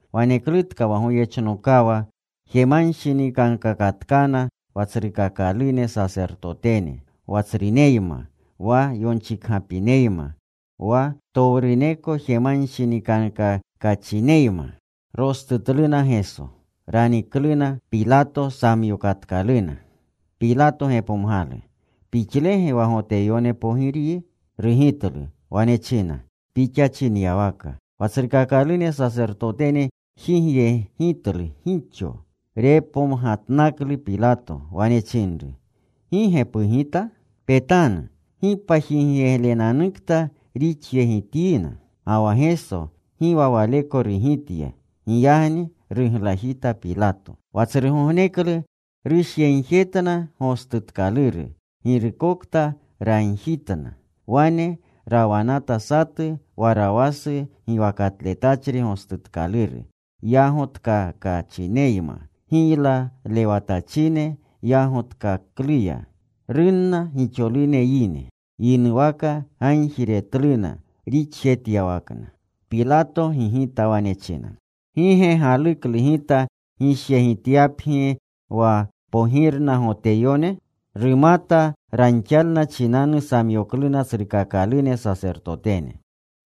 Waneklutka wa goyechnokawa jemanshinikankakatkana wa tsrukakalune sasertotene, wa tsruneyma, wa yonchikgapineyma, wa ptowruneko jemanshinikankakachineyma. Rostutluna Geso. Ranikatkaluna. Pilato samyokatkaluna. Pilato gepomgalu, “¿Pixlege wa Goteyone Pogiryi?” Rugitlu. Wane china, “Pixa chinyawaka.” Wa tsrukakalune sasertotene jigyegitlu gixo. Repomgatnaklu Pilato. Wane chinru, “¿Gi ge pugita? Petanu. ¡Gi pajigyeglenanukta rixyegityina!” Ga wa Geso gi wa waleko rugitya. Giyagni ruglajita Pilato. Wa tsrugogneklu rushyegjetna gostutkaluru girukokta ragjitna. Wane rawanata satu Warawasu giwakatletachri gostutkaluru yagotkakachineyma, giylalewatachine yagotkakluya. Runna gixolune yine. Yinuwaka gagjiretluna rixjetyawakna. Pilato gigitna. Wane china, “¿Gi ge galuklu gita gishyegityapgi wa Pogirna Goteyone?” Rumata ranxalna chinanu samyokluna tsrukakalune sasertotene.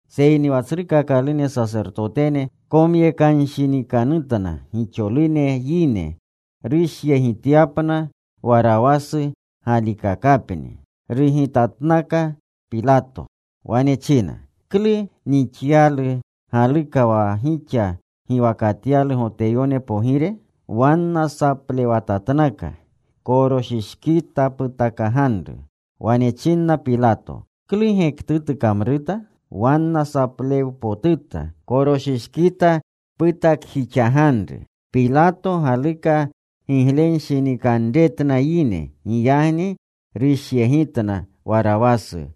Seyni wa tsrukakalune sasertotene komyekanshinikanutna gixolune yine rushyegityapna Warawasu galikakapni. Rugitatnakna Pilato. Wane china, “¿Klu nixyalu galuka wa gixa giwakatyalu Goteyone Pogire?” Wanna saplewatatnaka, “¡Koroshishkita putakjixaganru!” Wane chinna Pilato, “¿Klu gektutu kamruta?” Wanna saplewpotuta, “¡Koroshishkita putakjixaganru!” Pilato galuka giglenshinikanretna yine. Giyagni rushyegitna Warawasu.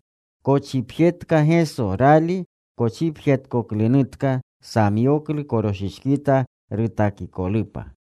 Kochipjetka Geso. Rali kochipjeretkoklunutka, samyoklu koroshishkita rutakikolupa.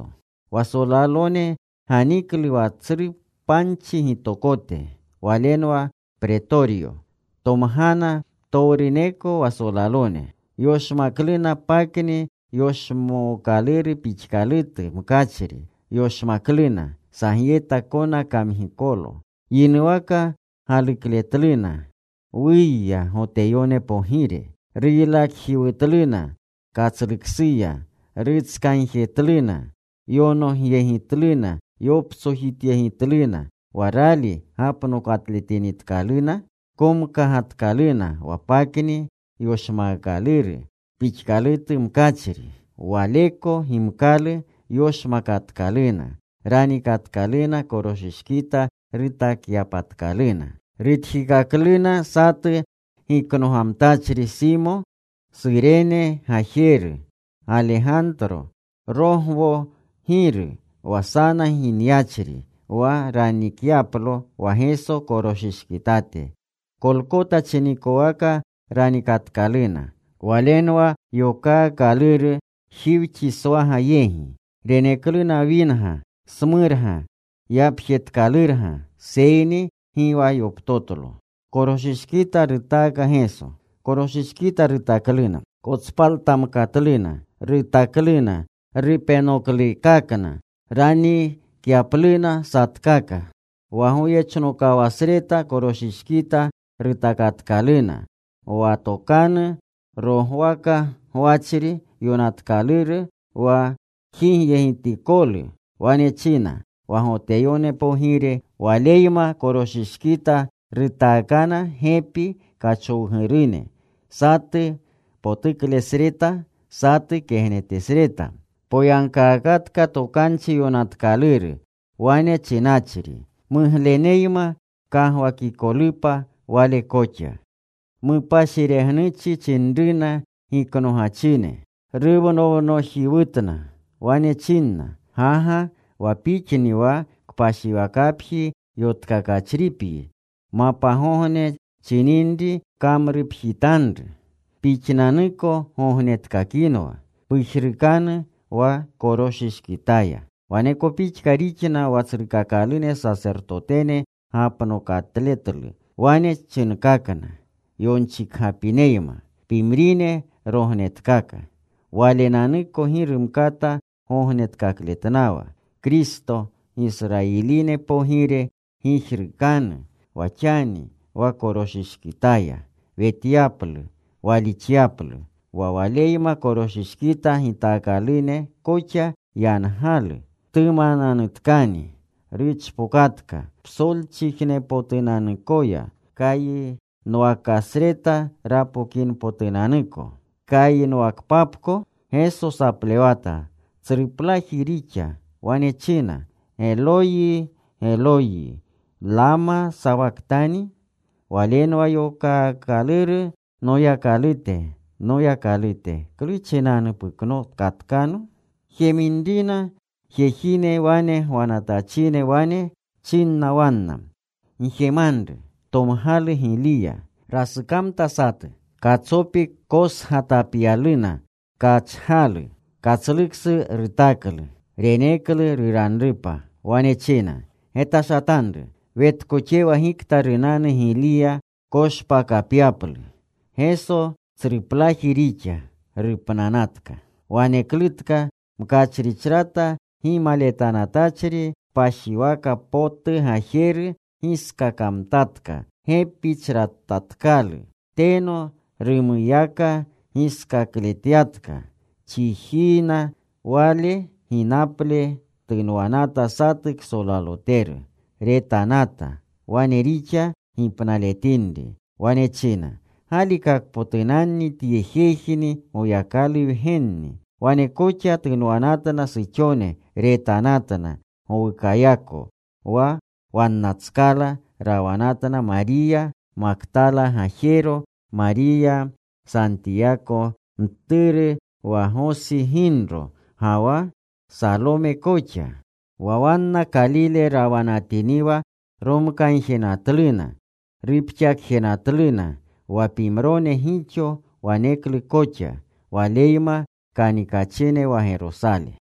Wa solalone ganiklu wa tsru panchi gitokote. Walenwa Pretoryo. Tomgana ptowruneko wa solalone. Yoshmakluna pakni yoshmookaluru pixkalutu mkachri. Yoshmakluna sagyeta kona kamgikolu. Yinuwaka galukletluna, “¡Wuya, Goteyone Pogire!” Ruylakjiwutluna katsluksuya. Rutskagjetluna. Yonogyegitluna. Yoptsojityegitluna. Wa rali gapnokatletinitkaluna, komkagatkaluna wa pakni yoshmookaluru pixkalutu mkachri. Waleko gimkalu yoshmakatkaluna. Ranikatkaluna koroshishkita rutakyapatkaluna. Rutjikakluna satu giknogamtachri, Simo, Surene gajeru, Galegantro, Rogwo giru, wa sana ginyachri wa ranikyaplo wa Geso koroshishkitate. Kolkota chinikowaka ranikatkaluna. Walenwa yokaakaluru, Jiwchiswaga yegi. Renekluna winga smurna yapjetkalurga, seyni gi wa yoptotlo. Koroshishkita rutakluna. Kotspaltamkatluna. Rutakluna rupenookaklena ranikyapluna satkaka. Wa goyechnokawasreta koroshishkita rutakatkaluna. Wa tokanu rogwaka gwachri yonatkaluru wa jigyegitikolu, wane china, “Wa Goteyone Pogire.” Waleyma koroshishkita rutaakana gepi kachowgurune, satu potuklesreta, satu kegnetesreta. Poyagkaakatka Tokanchi Yonatkaluru, wane chinachri: Mugleneyma kagwakikolupa Wale koxa. Mupashiregnuchi chinruna giknogachine. Ruwnownojiwutna. Wane chinna, “¡Gaga! Wa Pixni wa kpashiwakapji yotkakachripyi, mapgogne chininri pkamrupjitanru. Pixnanuko gognetkakinwa. Pujrukanu wa koroshishkitaya.” Waneko pixka rixna wa tsrukakalune sasertotene gapnokatletlu. Wane chinkakna yonchikgapineyma, “Pimrine rognetkaka. Walenanuko gi rumkata gognetkakletnawa. Kristo, Gisrayiline Pogire gijrukanu wa xani wa koroshishkitaya. Wetyaplu. Walixyaplu.” Wa Waleyma koroshishkita gitaakalune koxa yangalu. Tumananutkani ruchpokatka psolchijnepotunanuyako kayinwakasreta rapokinpotunanuko. Kayinwakpapko Geso saplewata. Tsruplaji rixa. Wane china, “Geloyi, Geloyi, ¿Glama sawajtani?” Walenwa yokaakaluru: “Noyakalute, Noyakalute, ¿klu chinanu puknokatkano?” Jeminrina pimrine wane gwanatachine, wane chinna wanna, “Gjemanru. Tomgalu Giliya.” Rasukamta satu. Katsopi kotsgatapyaluna kachgalu. Katsluksu rutaklu. Reneklu ruranrupa. Wane china, “Getashatanru. Wetkoxewa gikta runanu Giliya koshpakapyaplu.” Geso tsruplaji rixa. Rupnanatka. Waneklutka mkachrichrata gimaletanatachri kpashiwaka potu gajeru giskakamtatka gepichratatkalu. Teno rumuyaka giskakletyatka chijiina. Wale ginaple tunwanata satu ksolaloteru. Retanata wane rixa gipnaletinri. Wane china, “Galikakpotunanni tye jejni Goyakalu Wgenni.” Wane koxa tunwanatna suxone. Retanatna gowukayako. Wa wannatskala rawanatna Mariya Maktala gajero, Mariya Santiyako mturu wa Gosi ginro, ga wa Salome koxa. Wa wanna Kalile rawanatiniwa romkagjenatluna. Rupxakjenatluna. Wa pimrone gixo waneklu koxa, Waleyma kanikachine wa Gerosale.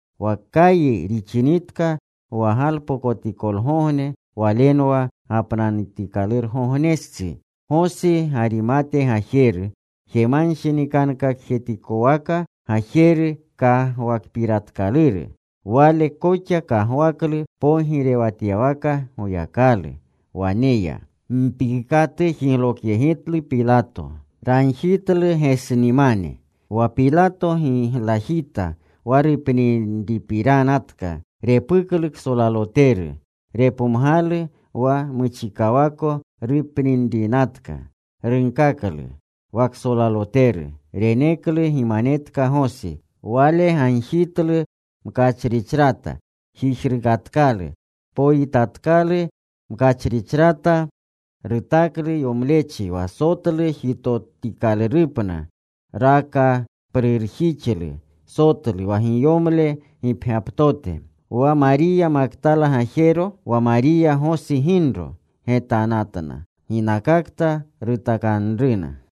Wa kayi rixinitka wa galpokotikolgogne, walenwa gapnanutikalurgognestsi. Gosi Garimate gajeru, jemanshinikankakjetikowaka gajeru kagwakpiratkaluru. Wale koxa kagwaklu pogirewatyawaka Goyakalu. Wane ya. Mpiikatu jiglokyegitlu Pilato. Ragjitlu Gesnimane. Wa Pilato giglajita wa rupninrinatka. Repuklu ksolaloteru. Repomgalu wa muchikawako rupninrinatka. Runkaklu wa ksolaloteru. Reneklu gimanetka Gosi. Wale gagjitlu mkachrichrata. Jijrukatkalu. Poyitatkalu mkachrichrata. Rutaklu yomlechi wa sotlu jitotikalurupna. Rakaprurjixlu sotlu wa giyomle gipgyaptote. Wa Mariya Maktala gajero, wa Mariya Gosi ginro, getanatna ginakakta rutakanunruna.